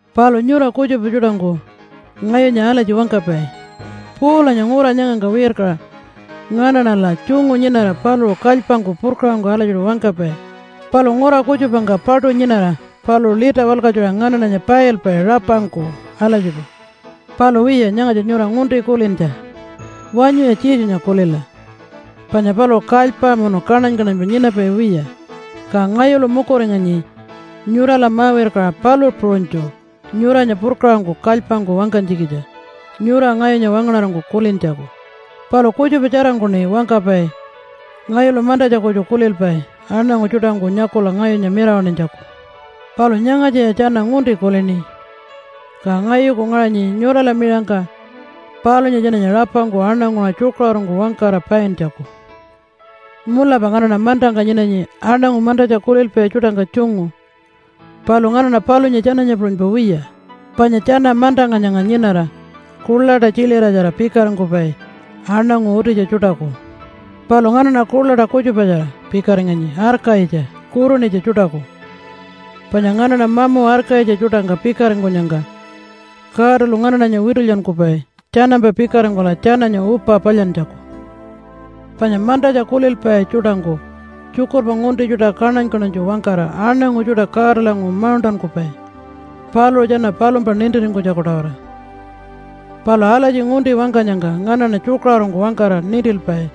Palu nyura kutjupa tjuṯangku ngayunya alatji wangkapai, “Paulanya ngura nyangangka wirkaṟa nganaṉala tjungu nyinara paluṟu kalypangku purkaṟangku alatjiṯu wangkapai, palu ngura kutjupangka paṯu nyinara paluṟu lita walkatjuṟa nganaṉanya pailpai rapangku alatjiṯu.” Palu wiya, nyangatja nyura ngunti kulintja. Wanyuya Jesunya kulila! Panya paluṟu kalypa munu kaṉany-kaṉanypa nyinapai wiya. Ka ngayulu mukuringanyi nyurala ma-wirkaṟa palu puṟunytju nyuranya purkaṟangku kalypangku wangkanytjikitja nyura ngayunya wangaṉarangku kulintjaku. Palu kutjupa tjarangkuṉi wangkapai ngayulu mantatja kutju kulilpai aṉangu tjuṯangku nyakula ngayunya mirawaṉinytjaku. Palu nyangatjaya tjana ngunti kulini, ka ngayuku ngaṟanyi nyurala miṟangka palunya tjananya rapangku aṉanguṟa tjukaṟurungku wangkara paintjaku. Mulapa nganaṉa mantangka nyinanyi aṉangu mantatja kulilpai tjuṯangka tjungu, palu nganaṉa palunya tjananya puṟunypa wiya. Panya tjana mantangka nyanga nyinara kuḻaṯa tjiliratjara pikaringkupai aṉangu utitja tjuṯaku. Palu nganaṉa kuḻaṯa kutjupatjara pikaringanyi arkayitja kurunitja tjuṯaku. Panya nganaṉa mamu arkayitja tjuṯangka pikaringkunyangka Godalu nganaṉanya witulyankupai tjanampa pikaringkula tjananya upa palyantjaku. Panya mantatja kulilpai tjuṯangku tjukurpa ngunti tjuṯa kaṉany-kaṉanytju wangkara aṉangu tjuṯa Godalanguṟu mauṉṯankupai paluṟu tjana palumpa nintiringkunytjaku-tawara. Palu alatji ngunti wangkanyangka nganaṉa tjukaṟurungku wangkara nintilpai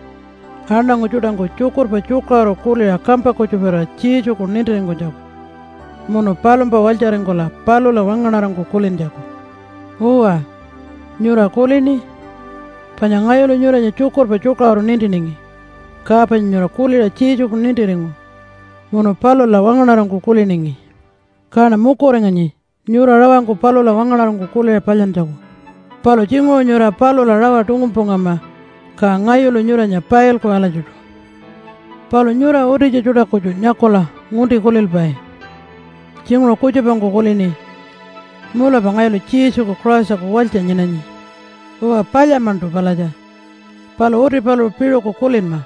aṉangu tjuṯangku tjukurpa tjukaṟuru kuliṟa kampa kutjuparira Jesuku nintiringkunytjaku munu palumpa walytjaringkula palula wangaṉarangku kulintjaku. Uwa, nyura kulini? Panya ngayulu nyuranya tjukurpa tjukaṟuru nintiningi, ka panya nyura kuliṟa Jesuku nintiringu munu palula wangaṉarangku kuliningi. Kaṉa mukuringanyi nyura rawangku palula wangaṉarangku kuliṟa palyantjaku. Palu tjinguṟu nyura palula rawa tungunpungama, ka ngayulu nyuranya pailku alatjiṯu. Palu nyura utitja tjuṯa kutju nyakula ngunti kulilpai. Tjinguṟu kutjupangku kulini, “Mulapa ngayulu Jesuku Christaku walytja nyinanyi.” Uwa palya-maṉṯu palatja, palu uti paluṟu piṟuku kulinma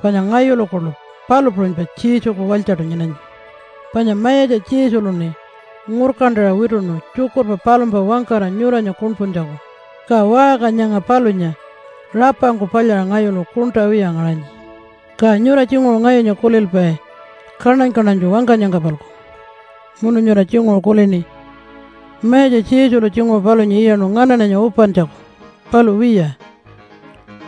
panya ngayulu kuḻu palu puṟunypa Jesuku walytjaṯu nyinanyi. Panya Mayatja Jesuluṉi ngurkantaṟa wituṉu tjukurpa palumpa wangkara nyuranya kuṉpuntjaku. Ka waṟka nyanga palunya rapangku palyaṟa ngayulu kuṉṯa wiya ngaṟanyi. Ka nyura tjinguṟu ngayunya kulilpai kaṉany-kaṉanytju wangkanyangka-palku, munu nyura tjinguṟu kulini, “Mayatja Jesulu tjinguṟu palunya iyaṉu nganaṉanya upantjaku.” Palu wiya,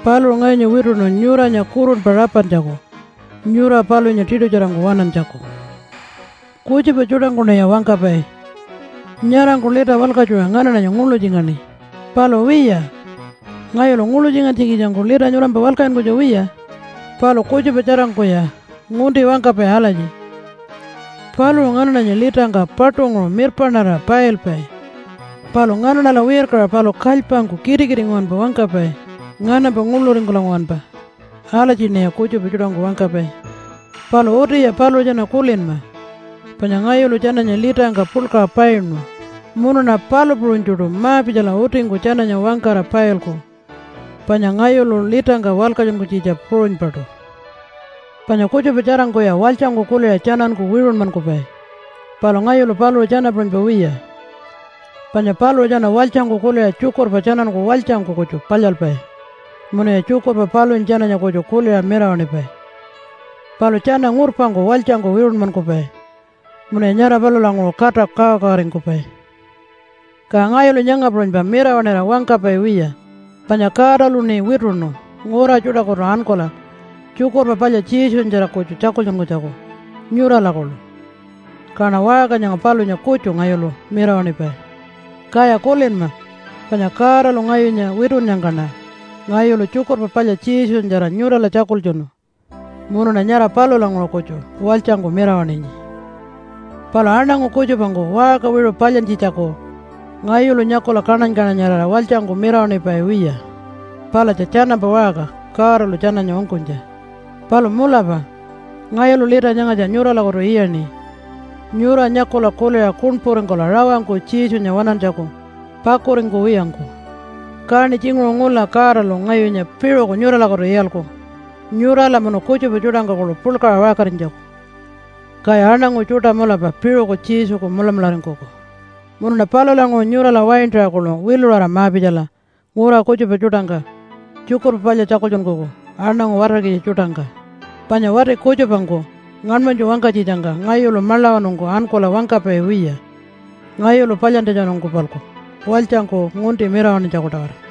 paluṟu ngayunya wituṉu nyuranya kurunpa rapantjaku nyura palunya tiṯutjarangku waṉantjaku. Kutjupa tjuṯangkuṉiya wangkapai, “Nyarangku lita walkatjuṟa nganaṉanya nguḻutjingaṉi.” Palu wiya, ngayulu nguḻutjingantjikitjangku lita nyurampa walkatjunkunytja wiya. Palu kutjupa tjarangkuya ngunti wangkapai alatji, “Paluṟu nganaṉanya litangka paṯunguṟu mirpaṉarira pailpai, palu nganaṉala wirkaṟa paluṟu kalypangku kitikiti nguwanpa wangkapai nganampa nguḻuringkula nguwanpa.” Alatjiṉiya kutjupa tjuṯangku wangkapai. Palu utiya paluṟu tjana kulinma! Panya ngayulu tjananya litangka puḻkaṟa painu munuṉa palu puṟunytjuṯu ma-pitjala utingku tjananya wangkara pailku, panya ngayulu litangka walkatjunkunytjitja puṟunypaṯu. Panya kutjupa tjarangkuya walytjangku kuliṟa tjananku wiṟunmankupai, palu ngayulu paluṟu tjana puṟunypa wiya. Panya paluṟu tjana walytjangku kuliṟa tjukurpa tjananku walytjangku kutju palyalpai munuya tjukurpa palunya tjananya kutju kuliṟa mirawaṉipai. Palu tjana ngurpangku walytjangku wiṟunmankupai munuya nyara palulanguṟu kata kawakawaringkupai. Ka ngayulu nyanga puṟunypa mirawaṉira wangkapai wiya, panya Godaluṉi wituṉu ngura tjuṯakutu ankula Tjukurpa Palya Jesunyatjara kutju tjakultjunkunytjaku nyurala kuḻu. Kaṉa waṟka nyanga palunya kutju ngayulu mirawaṉipai. Kaya kulinma, panya Godalu ngayunya witunnyangkaṉa ngayulu Tjukurpa Palya Jesunyatjara nyurala tjakultjunu, munuṉa nyara palulanguṟu kutju walytjangku mirawaṉinyi. Palu aṉangu kutjupangku waṟka wiṟu palyantjitjaku ngayulu nyakula kaṉany-kaṉanyarira walytjangku mirawaṉipai wiya. Palatja tjanampa waṟka Godalu tjananya ungkunytja. Palu mulapa ngayulu lita nyangatja nyuralakutu iyaṉi nyura nyakula kuliṟa kuṉpuringkula rawangku Jesunya waṉantjaku pakuringkuwiyangku. Kaṉi tjinguṟu ngula Godalu ngayunya piṟuku nyuralakutu iyalku nyurala munu kutjupa tjuṯangka kuḻu puḻkaṟa waṟkarinytjaku, kaya aṉangu tjuṯa mulapa piṟuku Jesuku mulamularingkuku. Munuṉa palulanguṟu nyurala waintaṟa kuḻu wiluṟara ma-pitjala ngura kutjupa tjuṯangka Tjukurpa Palya tjakultjunkuku aṉangu watarkitja tjuṯangka. Panya wati kutjupangku ngaṉmanytju wangkanytjitjangka ngayulu maḻawanungku ankula wangkapai wiya ngayulu palyantjatjanungku-palku walytjangku ngunti mirawaṉinytjaku-tawara.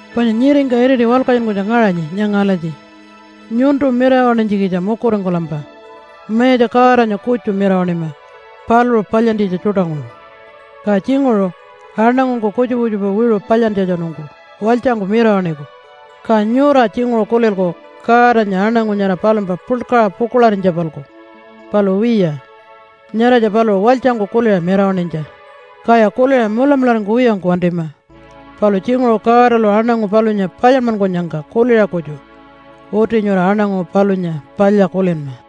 Panya nyiringka iriti walkatjunkunytja ngaṟanyi nyanga alatji, “Nyuntu mirawaṉinytjikitja mukuringkulampa Mayatja Godanya kutju mirawaṉima paluṟu palyantjitja tjuṯanguṟu.” Ka tjinguṟu aṉangungku kutjupa kutjupa wiṟu palyantjatjanungku walytjangku mirawaṉiku, ka nyura tjinguṟu kulilku Godanya aṉangu nyara palumpa puḻkaṟa pukuḻarinytja-palku. Palu wiya! Nyaratja paluṟu walytjangku kuliṟa mirawaṉinytja, kaya kuliṟa mulamularingkuwiyangku wantima. Palu tjinguṟu Godalu aṉangu palunya palyanmankunyangka kuliṟa kutju uti nyura aṉangu palunya palya kulinma.